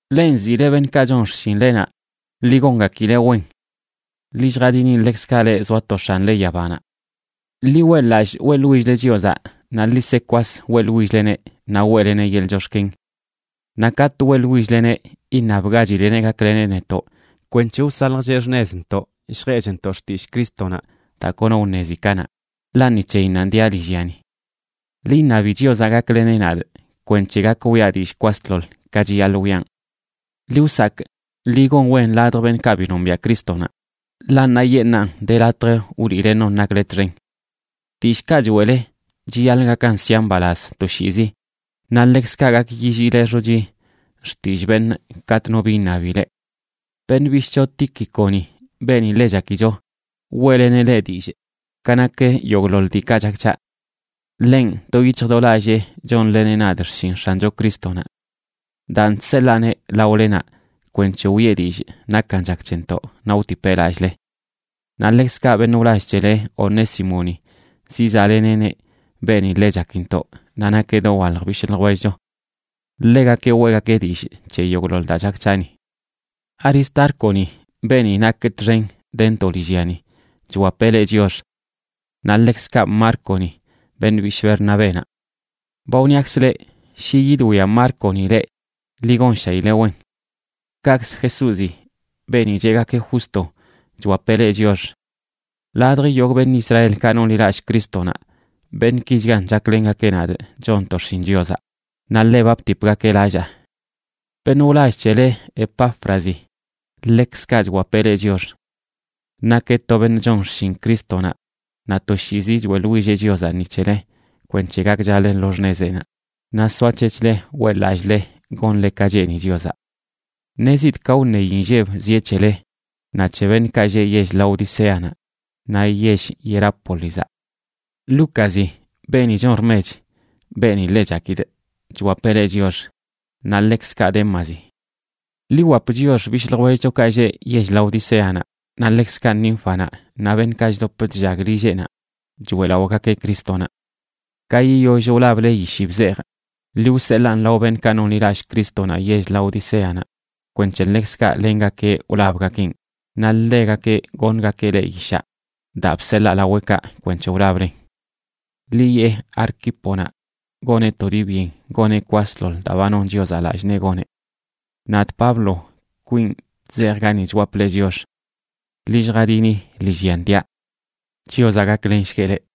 Leꞌ nziꞌle beṉꞌkaꞌ chon xshinlenaꞌ, ḻi gongakileꞌ wen. Ḻi lljadini ḻekzkaꞌ leꞌ zoa to X̱anle yabanaꞌ. Ḻi weꞌḻ-lallꞌ weꞌḻwill-le Chiozaꞌ, naꞌ ḻi se kwas weꞌḻwill-leneꞌ naꞌ weꞌleneꞌ yeḻꞌ chox̱ken. Naꞌ katꞌ weꞌḻwill-leneꞌ, iṉabgachileꞌneꞌ gakleneꞌ netoꞌ kwenc̱he wsaljcheꞌ xṉezntoꞌ lljeꞌchntoꞌ xtillꞌ Crístonaꞌ daa kono wṉezi kanaꞌ, ḻaꞌ ni c̱heyinnanꞌ diaꞌ lillyani. Ḻi iṉabi Chiozaꞌ gakleneꞌ nadꞌ kwenc̱he gak wiꞌa dillꞌ kwasḻoḻ, ka chiyaḻꞌ wiꞌan. Ḻi wsakꞌ ḻi gon wen ladj beṉꞌkaꞌ bi nombiaꞌ Crístonaꞌ, ḻaꞌ ṉaayeṉꞌnan de latj wliꞌle non nakle txen. Dillꞌkaꞌ choeꞌle chiyaḻꞌ gakan sia mbalaz toshiizi, naꞌ ḻekzkaꞌ gak yilliile xochi xtillꞌ beṉꞌ katꞌ no bi iṉabi leꞌ. Beṉꞌ bishꞌcho Tíquiconi, beeni ḻe chakicho, weꞌleneꞌ leꞌ dillꞌ ka nak yogꞌḻoḻ diikaꞌ chak c̱haꞌ. Ḻenꞌ do yic̱hj do lallee chonleneꞌ nadꞌ xshin X̱ancho Crístonaꞌ. Daan, chseḻaaneꞌ laolenaꞌ kwenc̱he wiꞌe dillꞌ nakan chak c̱hentoꞌ naꞌ wtipeꞌ lallꞌle. Naꞌ ḻekzkaꞌ beṉꞌ wlall c̱hele Onésimoni zizaꞌleneꞌneꞌ, beeni ḻe chakintoꞌ naꞌ nakeꞌ dowalj bishꞌ ljwellcho. Ḻegakeꞌ weꞌgakeꞌ dillꞌ c̱he yogꞌḻoḻ daa chak c̱haꞌ ni. Aristárconi, beeni nakꞌ txen dentoꞌ lillyani, chwapeꞌ leꞌ chiox; naꞌ ḻekzkaꞌ Márconaꞌ, beṉꞌ bishꞌ Bernabénaꞌ. Ba wniakzꞌ leꞌ shi yidwia Márconaꞌ leꞌ, ḻi gonshaileꞌ wen. Kaꞌkzə Jesúzi, beeni cheꞌgakeꞌ Justo, chwapeꞌ leꞌ chiox. Ladj yogꞌ beṉꞌ Israelkaꞌ nonḻilallꞌ Crístonaꞌ, beṉꞌkichgan chaklengakeꞌ nadꞌ chonntoꞌ xshin Chiozaꞌ, naꞌ ḻe ba btipgakeꞌ lallaa. Beṉꞌ wlall c̱hele, Epáfrazi, ḻekzkaꞌ chwapeꞌ leꞌ chiox. Nakeꞌ to beṉꞌ chon xshin Crístonaꞌ, naꞌ toshiizi choeꞌḻwilleꞌ Chiozaꞌ ni c̱hele kwenc̱he gakchale lo xṉezeꞌnaꞌ, naꞌ soac̱hec̱hle weꞌḻ-lallꞌle gonle ka cheeni Chiozaꞌ. Ṉezidꞌ ka wṉeyi nlleb zieꞌ c̱hele naꞌ c̱he beṉꞌkaꞌ lleꞌ yell Laodicéanaꞌ naꞌ yell Hierápolizaꞌ. Lúcazi, beeni chon rmech, beeni ḻe chakidꞌ, chwapeꞌ leꞌ chiox, naꞌ ḻekzkaꞌ Démazi. Ḻi wwap chiox bishꞌ ljwellchokaꞌ lleꞌ yell Laodicéanaꞌ, naꞌ ḻekzkaꞌ Nínfanaꞌ naꞌ beṉꞌkaꞌ chdop chllag lilleꞌnaꞌ choeꞌlaꞌogakeꞌ Crístonaꞌ. Ka yiyoll wlable yishi bzejꞌ, ḻi wseḻaan lao beṉꞌkaꞌ nonḻilallꞌ Crístonaꞌ yell Laodicéanaꞌ kwenc̱he ḻekzkaꞌ lengakeꞌ wlabgakeꞌn, naꞌ ḻegakeꞌ goṉgakeꞌ leꞌ yishaꞌ daa bseḻaa laweꞌkaꞌ kwenc̱he wlablen. Ḻi yeꞌ Arquíponaꞌ goneꞌ to dii byen goneꞌ kwasḻoḻ daa ba non Chiozaꞌ lallꞌ nee goneꞌ. Nadꞌ, Pablo, kwinꞌ chzejꞌa gani chwapꞌ leꞌ chiox. Ḻi lljadini lillyan diaꞌ. Chiozaꞌ gaklenshgueꞌ leꞌ.